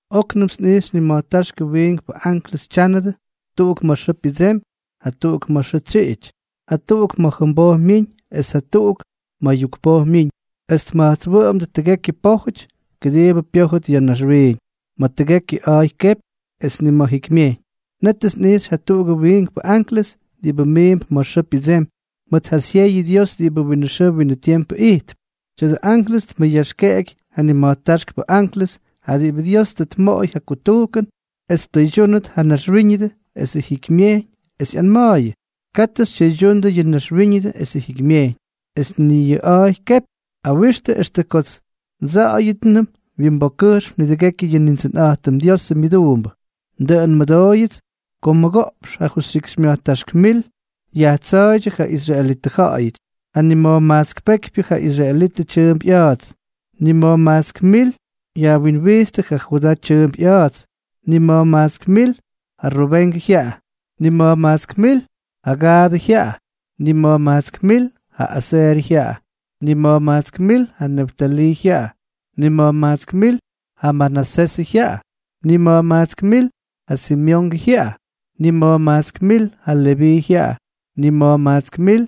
Oknʉmts nꞌijxy nima̱jtáxkʉ wiinkpʉ anklʉs tyánʉdʉ, tuꞌuk ma̱ xʉʉ pyʉdsemy, jatuꞌuk ma̱ xʉʉ tsyiꞌity, jatuꞌuk ma̱ jʉmboj myiñ, es jatuꞌuk ma̱ yukpoj myiñ, es tma̱jtswʉꞌʉmdʉ tʉgekyʉ pójʉty, kʉdiibʉ pyójʉt ya̱ naxwiiñ ma̱ tʉgekyʉ a̱a̱y kepy, es ni ma̱ jikymyejyñ. Nétʉts nꞌijxy jatuꞌugʉ wiinkpʉ anklʉs diꞌibʉ miimp ma̱ xʉʉ pyʉdsemy, mʉt ja syeyʉ Dios diꞌibʉ winʉ xʉʉ winʉ tiempʉ ijtp. Tya̱dʉ anklʉs tmʉyaxykyeky ja nima̱jtáxkpʉ anklʉs, ja diꞌibʉ Dios tʉ tmoꞌoy ja kutujkʉn es ttʉydyúnʉt yʉ naxwíñʉdʉ esʉ jikymyejyñ, es ꞌyanma̱a̱yʉ: —Katʉ xytyʉydyundʉ yʉ naxwíñʉdʉ esʉ jikymyejyñ, es ni yʉ a̱a̱y kepy. Awixtʉ extʉ kots ndsa̱ꞌa̱yʉtnʉm wyimbokkʉjxm nidʉgekyʉ yʉ Nindsʉnꞌa̱jtʉm Diosʉ myʉduumbʉ. Dʉꞌʉn nmʉdóyʉts ko mʉgoꞌpx jajustyikxymya̱jtáxk mil yajtsa̱a̱ydyʉ ja israelitʉ ja̱ꞌa̱yʉty, ja nima̱jmajtsk pekypyʉ ja Israelʉ tyʉʉmp ꞌya̱a̱ts: nima̱jmajtsk mil yajwinwijtstʉ ja Judaa tyʉʉmp ꞌya̱a̱ts, nima̱jmajtsk mil ja Rubengʉ jyaꞌa, nima̱jmajtsk mil ja Gaadʉ jyaꞌa, nima̱jmajtsk mil ja Aserʉ jyaꞌa, nima̱jmajtsk mil ja Neftalii jyaꞌa, nima̱jmajtsk mil ja Manasesʉ jyaꞌa, nima̱jmajtsk mil ja Simeongʉ jyaꞌa, nima̱jmajtsk mil ja Leví jyaꞌa, nima̱jmajtsk mil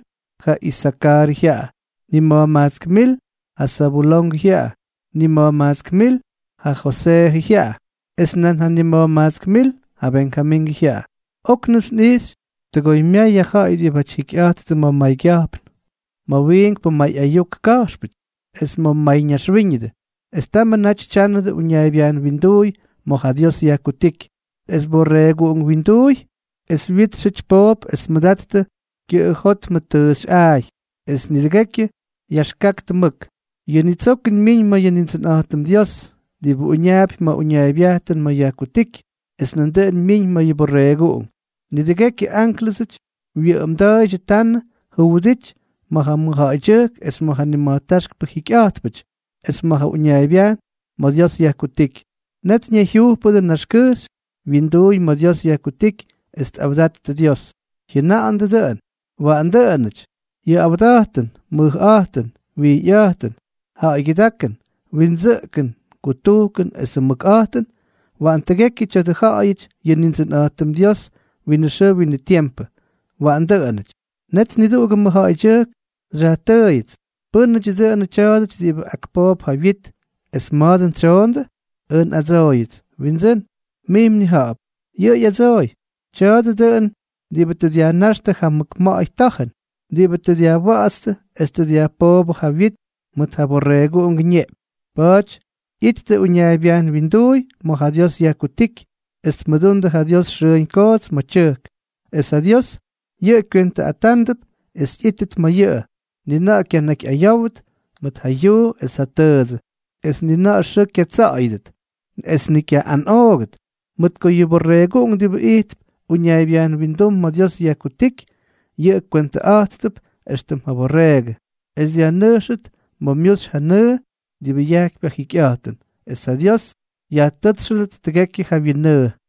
ja Isakarʉ jyaꞌa, nima̱jmajtsk mil ja Zabulongʉ jyaꞌa, nima̱jmajtsk mil ja Joseejʉ jyaꞌa, es nan nima̱jmajtsk mil ja Benjamingʉ jyaꞌa. Oknʉmts nꞌijxy tʉgoymyay ja ja̱ꞌa̱y diꞌibáty jikyꞌa̱jttʉ ma̱ maygya̱jpn, ma̱ wiinkpʉ may ayuk ka̱jxpʉty, es ma̱ mayñaxwíñʉdʉ. Es tamʉ naty tyánʉdʉ uñaaybyajn winduuy ma̱ ja Dios yajkutíky, es Borreeguꞌunk wyinduuy, es wyítxʉty poop, es tmʉdattʉ kyʉꞌʉjótmʉ tʉʉxyꞌa̱a̱y. Es nidʉgekyʉ yaxkaktʉ mʉk: Yʉ nitsokʉn myiñ ma̱ yʉ Nindsʉnꞌa̱jtʉm Dios, diꞌibʉ uñaapy ma̱ uñaaybyajn ma̱ yajkutíky, es nandʉꞌʉn myiñ ma̱ yʉ Borreeguꞌunk. Nidʉgekyʉ ánklʉsʉty wyʉꞌʉmda̱a̱ydyʉ tanʉ juwʉdity ma̱ ja mʉjja̱ꞌa̱ydyʉjk, es ma̱ ja nima̱jtáxkpʉ jikyꞌa̱jtpʉty, es ma̱ ja uñaaybyajn ma̱ Dios yajkutíky. Net ñayjyujpʉdʉ naxkʉjxy wyinduuy ma̱ Dios yajkutíky, es tꞌawdattʉ Dios, jyʉna̱ꞌa̱ndʉ dʉꞌʉn: ¡Waꞌan dʉꞌʉnʉty! Yʉ awda̱jtʉn, mʉjꞌa̱jtʉn, wijyꞌa̱jtʉn, ja̱ꞌa̱ygyʉdákʉn, windsʉꞌkʉn, kutujkʉn esʉ mʉkꞌa̱jtʉn, waꞌan tʉgekyʉ tya̱a̱dʉ tjaꞌaꞌáty yʉ Nindsʉnꞌa̱jtʉm Dios winʉ xʉʉ winʉ tiempʉ. Waꞌan dʉꞌʉnʉty. Net niduꞌugʉ mʉjja̱ꞌa̱ydyʉjk xyajtʉʉyʉts: —¿Pʉ́nʉdyʉ dʉnʉ tya̱a̱dʉty diꞌibʉ ak poop ja wyit, es ma̱a̱ dʉn tsyoondʉ? Ʉj nꞌadsooyʉts: —Windsʉ́n, mij mnija̱ꞌa̱p. Yʉꞌʉ ꞌyadsooy: —Tya̱a̱dʉ dʉꞌʉn diꞌibʉ tʉ dyajnáxtʉ ja mʉk ma̱ꞌa̱y ta̱jʉn, diꞌibʉ tʉ dyajwa̱ꞌa̱tstʉ es tʉ dyajpoobʉ ja wyit mʉt ja Borreeguꞌungʉ ñeꞌpyñ. Pa̱a̱ty ꞌyittʉ uñaaybyajn winduuy ma̱ ja Dios yajkutíky, es tmʉdundʉ ja Dios xʉʉñ koots ma̱ tyʉjk. Es ja Dios yʉꞌʉ kwentʉꞌatánʉdʉp es ꞌyítʉt ma̱ yʉꞌʉ. Ni na̱ꞌa̱ kyanakyꞌayówʉt mʉt ja yuu es ja tʉʉdsʉ, es ni ja xʉʉ kyatsa̱ꞌa̱yʉdʉt, es ni kyaꞌꞌanꞌoogʉt, mʉt ko yʉ Borreeguꞌunk diꞌibʉ ijtp uñaaybyajn windum ma̱ Dios yajkutíky, yʉꞌʉ kywentʉꞌa̱jttʉp éxtʉm ja byorreegʉ, es dyajnʉjxʉt ma̱ myuxy ja nʉʉ diꞌibʉ yajkypy ja jikyꞌa̱jtʉn. Es ja Dios yajtʉ́tsxʉdʉt tʉgekyʉ ja wyinnʉʉ.